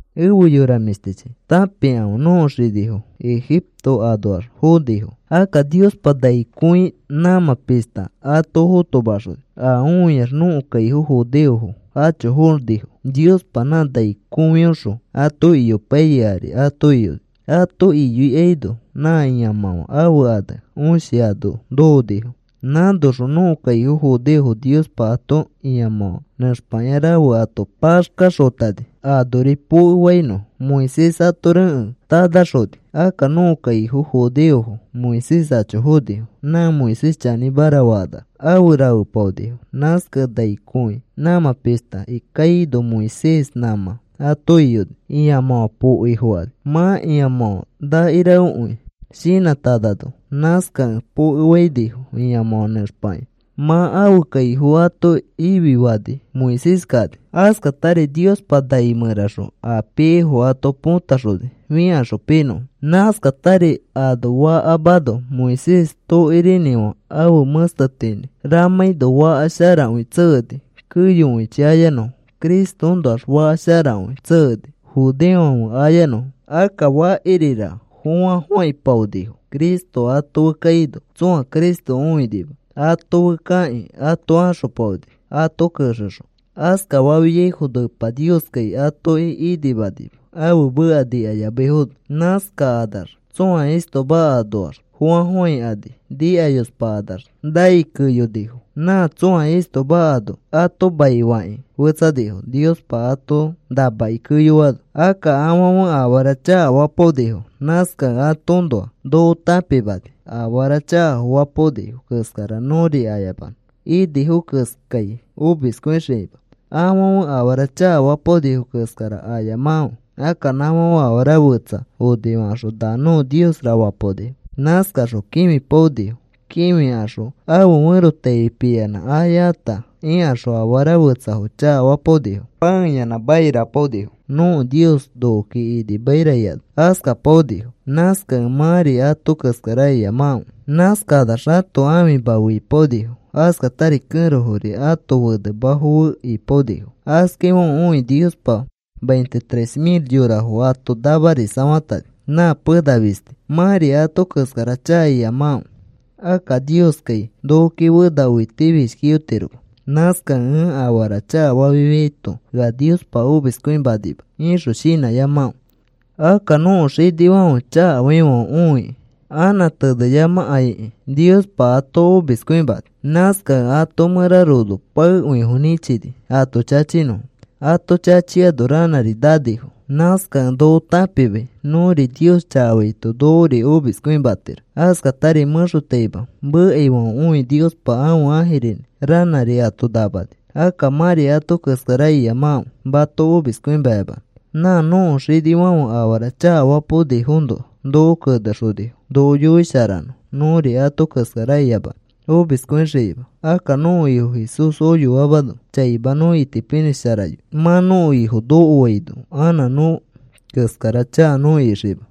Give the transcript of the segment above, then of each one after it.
Efe yora mĩshtichi, tãpikãfe. Nõko xinifo Egipto anoax fonifo. Akka Niospa nai kõi nãmã pishta ato fotomaxoni a õiax nõko kaifo judeofo acho fonifo. Niospa nã nai kõiõxõ ato iyopaiyai ari ato iyoni. Ato iyoikaino nã ĩamãfã ãfe ane Õshi ano nokonifo. Nãnoxõ nõko kaifo judeofo Niospa ato ĩamãfã nẽxpakĩa rafe ato paxkaxotani anori pokefainõfo. Moisés ato rekẽ tanaxoni. Akka nõko kaifo judeofo Moisés acho fonifo. Nã Moisés chanĩmara fakanax afe rafepaonifo. Nãskakẽ nai kõi nãmã pishta kaino Moisés nãmã ato iyoni. Ĩamãfã pokeifokani mã ĩamãfã nakirafekõi shinãtanano. Nãskakẽ pokefainifo ĩamãfã nẽxpakĩa. Mã ãfe kaifo ato ififani Moisés kani. Askatari Niospa nai mẽraxõ a piaifo ato potaxoni fikaxõ pinõfo. Nãskatari ano fakamano Moisés tokirinĩfã ãfe mẽstetinĩ ramãino faka sharakõi tsekeni keyokõichi ayanõfo. Cristoõnoax faka sharakõi tsekeni judeofãfe ayanõfo. Akka fakirira fofãfofãipaonifo Cristo ato fe kaino, tsõa Cristo õinima. ato fe kakĩ ato axopaoni ato kexexõ. Askafafiaifono Epa Nioskai atoki inimanima ãfe meka nikayamaifono. Nãskakanax tsõa istoma anoax fofãfofãikani nikayospakanax nai keyonifo. Nã tsõa istoma ano ato maifakĩ fetsanifo Niospa ato namakĩ keyoano. Akka afãfe afara chakafapaonifo. Nãskakẽ atoõnoa noko tãpimani afara chakafo fapaonifo keskara nõri ayamanõ inifo keskai omiskõixikima. Afãfe afara chakafapaonifo keskara ayamakãfe. Akka nãfãfe afara fetsa onifakaxõ, “Na nõko niosra,” fapaonifo. Nãskakaxõ kĩfipaonifo. Kĩfikaxõ ãfe ferotaifi piyanã ayata ikaxõ afara fetsafo chakafapaonifo. Pãeyanã monopaonifo. “Nõko nios nokoki inimaira,” ikanax askapaonifo. Nãskakẽ mãri ato keskara iyamakãfe. Nãskakanax ãto ãfima fe ipaonifo. Askatari kẽrofori ãto fenemafo fe ipaonifo. Askaifãfe õikĩ Niospa veintitrés mil yorafo ato namarisafatani nã pena fisti. Mãri ato keskara chaka iyamakãfe. Akka, “Nioskai nokoki fena õitifishkiyotiroma. Nãskakẽ ẽ afara chakafafiaito ea Niospa omiskõimanima,” ixõ shinãyamakãfe. Akka nõko xinifãfe chakafaifãfe õikĩ anã teneyamakaikĩ Niospa ato omiskõimani. Nãskakẽ ato mẽra rono paekõifo nĩchini ato chachinõfo. Ato chachiano ranãri nanifo. Nãskakẽ noko tãpimai nõri Nios chakafaito nokori omiskõimatiro. Askatari mẽxotaima mekaifãfe õikĩ Niospa ãfe ãjirinĩ ranãri ato namani. Akka mãri ato keskara iyamakãfe mato omiskõimayamanõ. Nã nõko xinifãfe afara chakafapaonifoõnoa noko kenexonifo noko yoisharanõ nõri ato keskara iyamanõ omiskõixikima. Akka nõko Ifo Jesús oyoamano chaima nõ itipinĩsharayoi mã nõko Ifo nokoaino anã nõ keskara chaka nõ ixikima.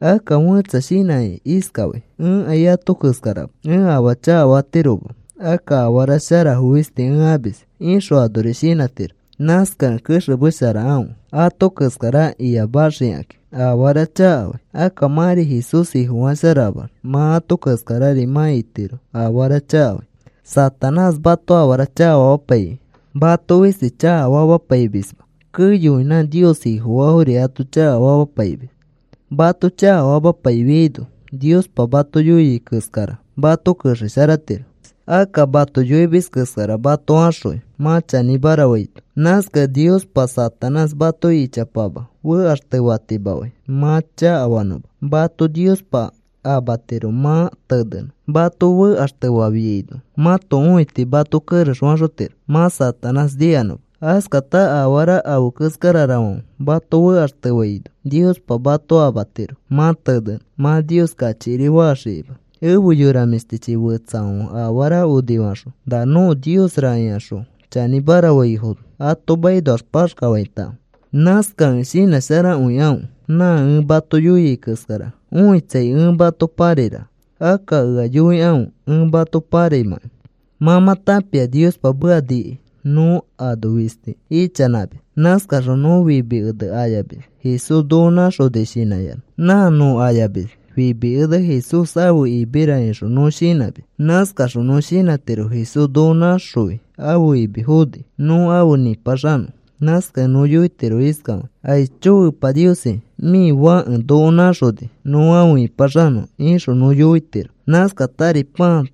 Akka fẽtsa shinãkĩ iskafai: “Ẽkai ato keskarama. Ẽ afaa chakafatiroma. Akka afara sharafo fisti ẽ amis,” ixõ anori shinãtiro. Nãskakẽ kexemesharakãfe ato keskara iyamaxikakĩ afara chakafai. Akka mãri Jesús Ifofasharamax mã ato keskarari mã itiro afara chakafai. Satanás mato afara chakafamapaikĩ mato fisti chakafamapaimisma. Keyokõi nã Nios Ifofaafori ato chakafamapaimis. Mato chakafamapaifiaino Niospa mato yoia keskara mato kexesharatiro mã afaa chakafanõma. Akka mato yoimis keskara mato axõi mã chanĩmara faito. Nãskakẽ Niospa Satanás mato ichapama fekaxtefatimafai mã chakafanõma. Mato Niospa amatiro mã tenenõ mato fekaxtefafiaino. Mãto õiti mato kerexfaxotiro mã Satanás nikanõma. Askatari afara afe keskararafãfe mato fekaxtefaino Niospa mato amatiro mã tenenõ mã Nios kachikirifaxikima. Efe yora mĩshtichi, fetsafãfe afara onifakaxõ, “Na nõko niosra,” ikaxõ chanĩmara faifono ato makinoax paxkafaitakãfe. Nãskakẽ shinãsharakõikãfe nã ẽ mato yoiai keskara õitsai ẽ mato pãrairaka. Akka ea yoikãfe ẽ mato pãraimãkai. Mã mã tãpia Niospa meka nikai nõ ano fisti ichanãmis. Nãskaxõ nõ fimi ene ayamis Jesús noko nãxoni shinãyanã. Nã nõ ayamis, “Fimi ene Jesús ãfe imira,” ixõ nõ shinãmis. Nãskaxõ nõ shinãtiro Jesús noko naxõi ãfe imi foni nõ afe nĩpaxanõ. Nãskakẽ nõ yoitiro iskafakĩ: “Aicho Epa Niosi, mĩ Fãke noko nãxoni nõ afe ĩpaxanõ,” ixõ nõ yoitiro. Nãskatari pãa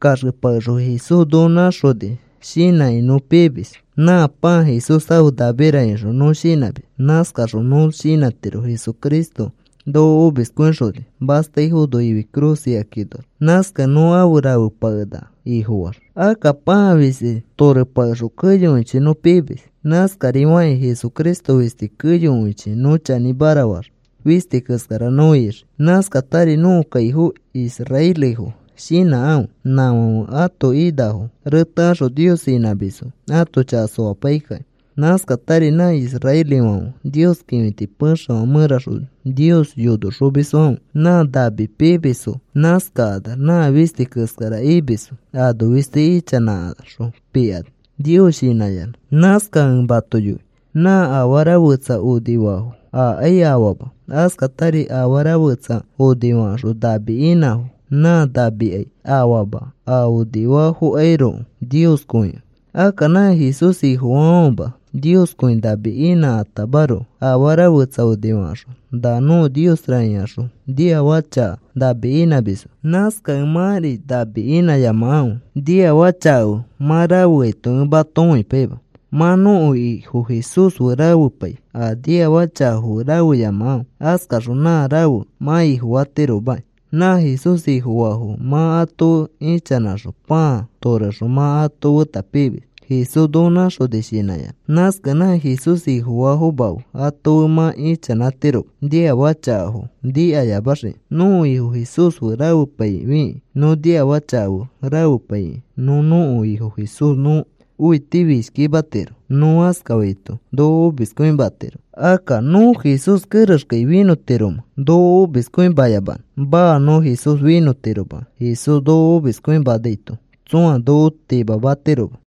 torepakexõ Jesús noko nãxoni shinãkĩ nõ pimis. “Nã pãa Jesús ãfe namira,” ixõ nõ shinãmis. Nãskaxõ nõ shinãtiro Jesucristo noko omiskõixoni mastaifono ifi cruz ikakinoax. Nãskakẽ nõ afe rafepakenaka Ifofaax. Akka pãa fisti torepakexõ keyokõichi nõ pimis. Nãskarifakĩ Jesucristo fisti keyokõichi nõ chanĩmara faax fisti keskara nõ ixii. Nãskatari nõko kaifo israelifo shinãkãfe. Nãfãfe ãto inafo retekaxõ Nios inãmisfo ãto chaka soapaikakĩ. Nãskatari nã israelifãfe Nios kĩfiti pexefã mẽraxõ Nios yonoxomisfãfe nã nami pimisfo. Nãskakanax nã fisti keskara imisfo ano fisti ichanãnãkaxõ pikani Nios shinãyanã. Nãskakẽ ẽ mato yoi nã afara fetsa onifafo akai afama. Askatari afara fetsa onifakaxõ nami inãfo nã namikai afama a onifafokairoko Nioskõikẽ. Akka nã Jesús Ifofaafãfema Nioskõi nami inãtamaroko afara fetsa onifakaxõ, “Nã nõko niosra,” ikaxõ niafaka chaka nami inãmisfo. Nãskakẽ mãri nami inãyamakãfe. Niafaka chaka fe mã rafeaito ẽ mato õipaima. Mã nõko Ifo Jesús fe rafepai a niafaka chakafo fe rafeyamakãfe. Askaxõ nã rafe mã ifofatiromaki. Nã Jesús Ifofaafo fe mã ato fe ichanãkaxõ pãa torexõ mã ato feta pimis Jesús noko nãxoni shinãyanã. Nãskakẽ nã Jesús Ifofaafoma fe ato fe mã ichanãtiroma niafaka chakafo nikaxikĩma. Nõko Ifo Jesús fe rafepaifikĩ nõ niafaka chaka fe rafepaikĩ nõ nõko Ifo Jesús nõ õitifishkimatiro. Nõ askafaito noko omiskõimatiro. Akka, ¿nõ Jesús kerexkai finõtiromẽ noko omiskõimayamanõ? Maa, nõ Jesús finõtiroma. Jesús noko omiskõimanaito tsõa noko timamatiroma.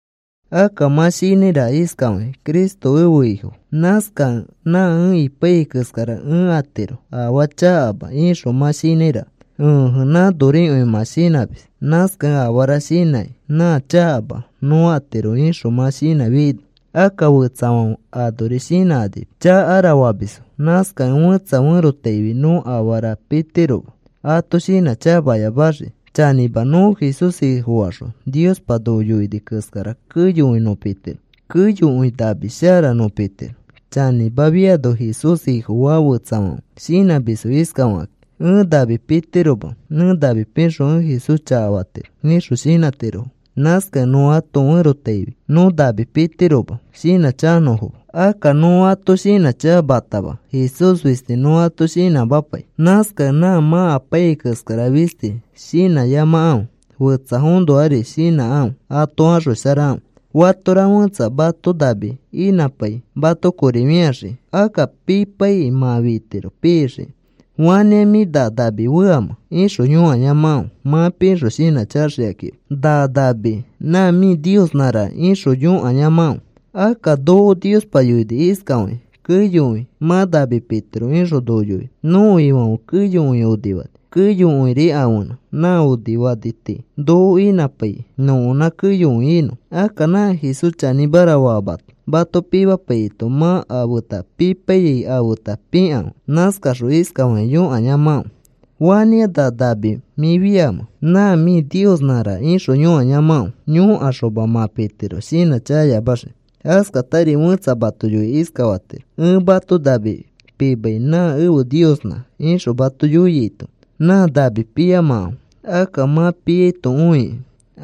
Akka mã shinãiraka iskafakĩ: “Cristo ẽfe Ifo. Nãskakẽ nã ẽ apaiyai keskara ẽ atiro, afaa chakama,” ixõ mã shinãiraka. Ẽje, nãnorikõi mã shinãmis. Nãskakẽ afara shara shinãkĩ: “Nã chakama nõ atiro,” ixõ mã shinãfiaino akka fetsafãfe anori shinãkanima: “Chakara,” famisfo. Nãskakẽ fẽtsa ferotaifi nõ afara pitiroma ato shinãchakayamaxikĩ. Chanĩma, nõ Jesús Ifofaxõ Niospa noko yoini keskara keyokõi nõ pitiro. Keyokõi nami shara nõ pitiro. Chanĩmakõifiano, Jesús Ifofaa fetsafãfe shinãmisfo iskafakakĩ: “Ẽ nami pitiroma. Ẽ nami pixõ ẽ Jesús chakafatiro,” ixõ shinãtirofo. Nãskakẽ nõ ato ferotaifi nõ nami pitiroma shinãchakanõfoma. Akka nõ ato shinãchakamatama Jesús fisti nõ ato shinãmapai. Nãskakẽ nã mã apaiyai keskara fisti shinãyamakãfe. Fetsafoõnoari shinãkãfe. Ato axosharakãfe. Fatora fẽtsa mato nami inãpai mato kori fĩaxikĩ akka pipaikĩ mã fitiro pixikĩ. “¿Fanĩa mĩ na nami feamẽ?” ixõ yõkayamakãfe mã pixõ shinãchakaxikakĩma: “Nã nami nã mĩ niosnãraka,” ixõ yõkayamakãfe. Akka noko Niospa yoini iskafakĩ: “Keyokõi mã nami pitiro,” ixõ noko yoini. Nõko Ifãfe keyokõi onifani. Keyokõiri ãfenã. Nã onifani tii noko inãpai nõkonã keyokõi inõ. Akka nã Jesús chanĩmara famato mato pimapaiyaito mã a feta pipaiyai afeta pikãfe. Nãskaxõ iskafakĩ yõkayamakãfe: “¿Fanĩa na nami mĩ feamẽ? Nã mĩ niosnãraka,” ixõ yõkayamakãfe. Yõkaxoma mã pitiro shinãchakaxikima. Askatari fẽtsa mato yoikĩ iskafatiro: “Ẽ mato nami pimai nã ẽfe niosnã,” ixõ mato yoiaito nã nami piyamakãfe. Akka mã piaito õikĩ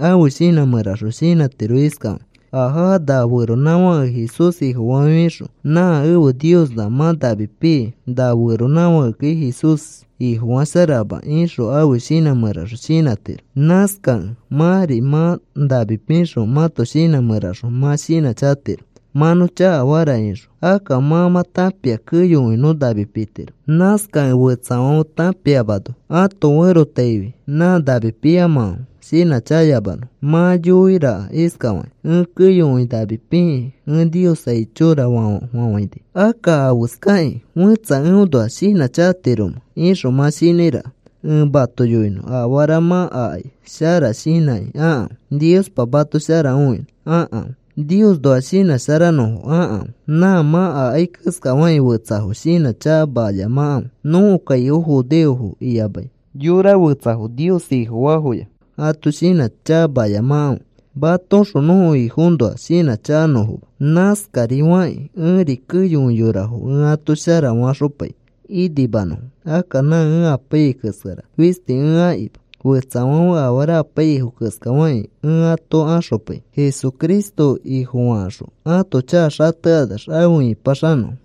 ãfe shinã mẽraxõ shinãtiro iskafakĩ: “Ajaa, na feronãfãke Jesús Ifofafiaxõ nã ẽfe niosnã mã nami pii. Na feronãfãkekai Jesús Ifofasharama,” ixõ ãfe shinã mẽraxõ shinãtiro. Nãskakẽ mãri mã nami pixõ mãto shinã mẽraxõ mã shinãchakatiro: “Mã nõ chakafara,” ixõ. Akka mã mã tãpia keyokõi nõ nami pitiro. Nãskakẽ fetsafãfe tãpiamano ato ferotaifi nã nami piyamakãfe shinãchakayamanõfo. Mã yoiraka iskafakĩ: “Ẽ keyokõi nami pikĩ ẽ Nios, ‘Aichora,’ fafafafãini. ¿Akka afeskakĩ fẽtsa eõnoa shinãchakatiromẽ?” ixõ mã shinãiraka. Ẽ mato yoinõ afara mã akai shara shinãkĩ akãfe. Niospa mato shara õinõ akãfe. Niosnoa shinãsharanõfo akãfe. Nã mã akai keskafakĩ fetsafo shinãchakamayamakãfe. Nõko kaifo judeofo iyamai mani fetsafo Nios Ifofaafoya ato shinãchakamayamakãfe matoõxõ nõko Ifoõnoa shinãchakanõfoma. Nãskari fakĩ ẽri keyokõi yorafo ẽ ato shara faxopai inimanõfo. Akka nã ẽ apaiyai keskara fisti ẽ akima. Fetsafãfe afara apaiyaifo keskafakĩ ẽ ato axopai Jesucristo Ifofakaxõ ato chaka xatekanax afe ĩpaxanõfo.